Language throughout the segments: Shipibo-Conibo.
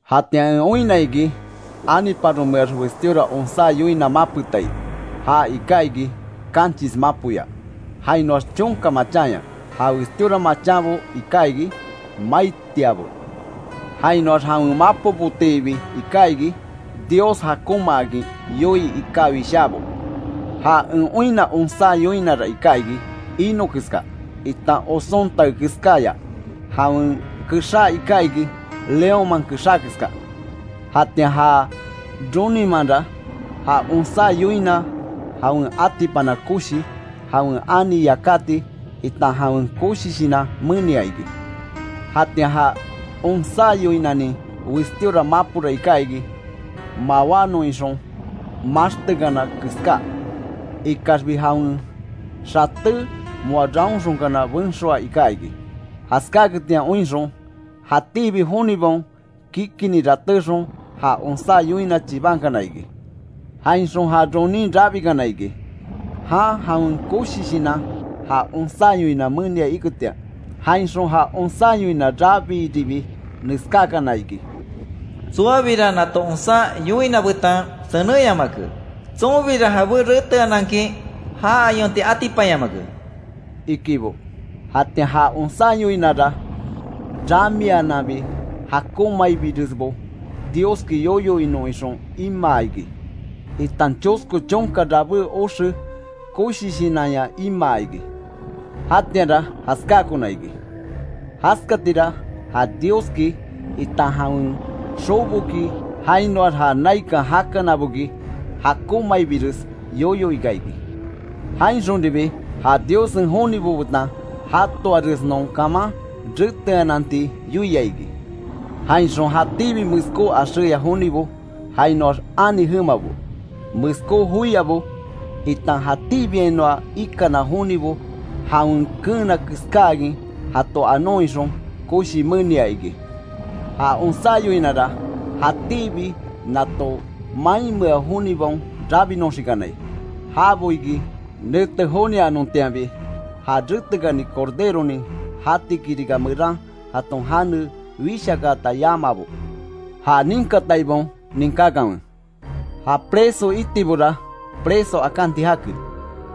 Jatian en oinna iki, aniparomeax westíora onsá yoina mapetai. Ja iká iki kanchis mapoya, jainoax chonka machanya. Ja westíora machanbo iká iki maitiabo. Jainoax jawen mapobotiibi iká iki, Dios jakonmaakin yoii iká wishábo. Ja en oinna onsá yoinara iká iki; ino keska, itan oson tae keskaya. Jawen kexá iká iki leónman kexá keska. Jatian ja roninmanra, ja onsá yoina jawen atipana koshi, jawen ani yakati, itan jawen koshi shinan menia iki. Jatian ja onsá yoinanin westíora mapora iká iki, mawánon ixon maxtekana keská. Ikaxbi jawen xaté moa raonxonkana benxoa iká iki. Jaskáketian oinxon, jatíbi jonibaon kikini ratéxon ja onsá yoina chibankana iki. Jainxon ja ronin rabikana iki, jan jawen koshi shinan ja onsá yoina menia iketian. Jainxon ja onsá yoina rabiiribi neskákana iki: “Tsoabira nato onsá yoina betan senenyamake; tsonbira jabé reteanankin ja ayonti atipanyamake”, ikibo. Jatian ja onsá yoinara, rabíananbi jakonmaibiresbo Dioski yoyo inon ixon imaa iki; itan chosko chonka rabé oxe koshi shinanya imaa iki. Jatianra jaskákona iki, jaskatira ja Dioski, itan jawen xoboki jainoax ja naikan jakanaboki jakonmaibires yoyo ika iki. Jainxonribi ja Diossen jonibo betan jatoaresnon kaman, reteananti yoia iki. Jainxon jatíbi meskó axéya jonibo, jainoax ani jemabo, meskó joiabo, itan jatíbiainoa ikana jonibo jawen keena keskáakin jato anon ixon koshi menia iki. Ja onsá yoinara jatíbi nato mainmea jonibaon rabinoxikanai; jabo iki nete jonianontianbi, ja retekani Corderonin jati kirika meran jaton jane wishakaata yamaabo. Ja ninkataibaon ninkákanwe: “Ja preso itibora, preso akanti jake;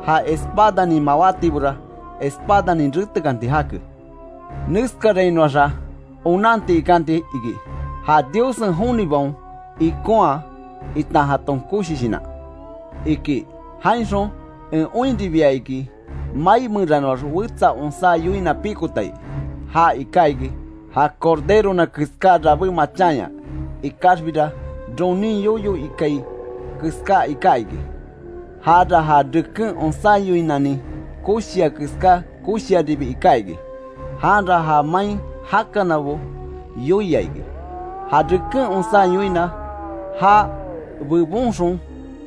ja espanin mawátibora; espadanin retekanti jake. Neskarainoaxa onanti ikanti iki, ja Diossen jonibaon ikonhaa, itan jaton koshi shinan”, iki. Jainxon en oinribia iki mai meranoax wetsa onsá yoina pikotai. Ja iká iki, ja corderona keská rabé machanya, ikaxbira ronin yoyo ikai keská iká iki. Jara ja reken onsá yoinanin koshia keská koshiaribi iká iki. Janra ja main jakanabo yoia iki, ja reken onsá yoina já bebonxon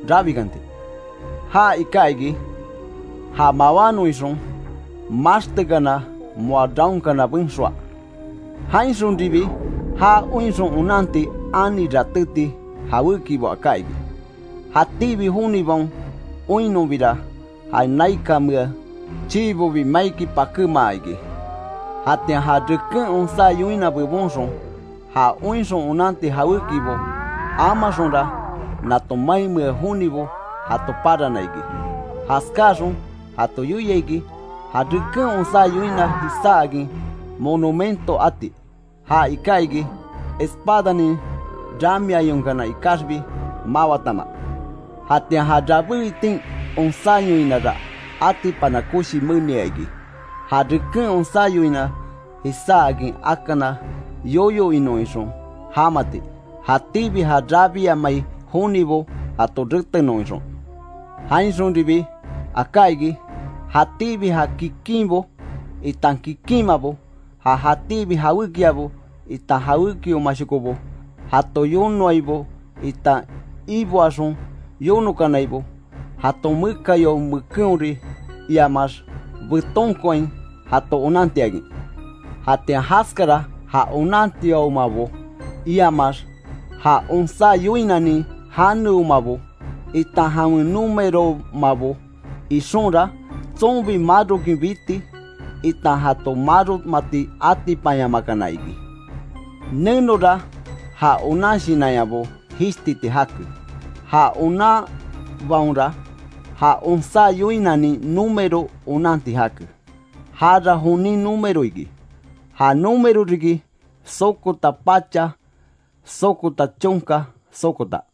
rabikanti. Ja iká iki ja mawánon ixon, maxtekana moa raonkana benxoa. Jainxonribi ja oinxon onanti ani ratéti jawékibo aká iki. Jatíbi jonibaon oinnonbira ja naikanmea chiibobi maiki pakémaa iki. Jatian ja reken onsá yoina bebonxon, ja oinxon onanti jawékibo amaxonra, nato mainmea jonibo jato parana iki. Jaskáaxon jato yoia iki, ja reken onsá yoina jisáakin monumento ati, ja iká iki espadanin ramiayonkana ikaxbi mawatama. Jatian ja rabé itin onsá yoinara atipana koshi menia iki. Ja reken onsá yoina jisáakin akana yoyo inon ixon jamati, jatíbi ja rabiamai jonibo jato retenon ixon. Jainxonribi aká iki; jatíbi ja kikinbo itan kikinmabo, ja jatíbi jawékiabo itan jawebiomashokobo, jato yonoaibo itan iboaxon yonokanaibo, jaton mekayao mekenhori iamaax betonkoain jato onantiakin. Jatian jaskara ja onantiaomabo, iamaax ja onsá yoinanin janeomabo, itan jawen númeroomabo ixonra, tsonbi marokin biti, itan jato maromati atipanyamakana iki. Nenora ja onan shinanyabo jishtiti jake; ja onanbaonra ja onsá yoinanin número onanti jake, jara jonin número iki, ja número riki sokota pacha sokota chonka sokota.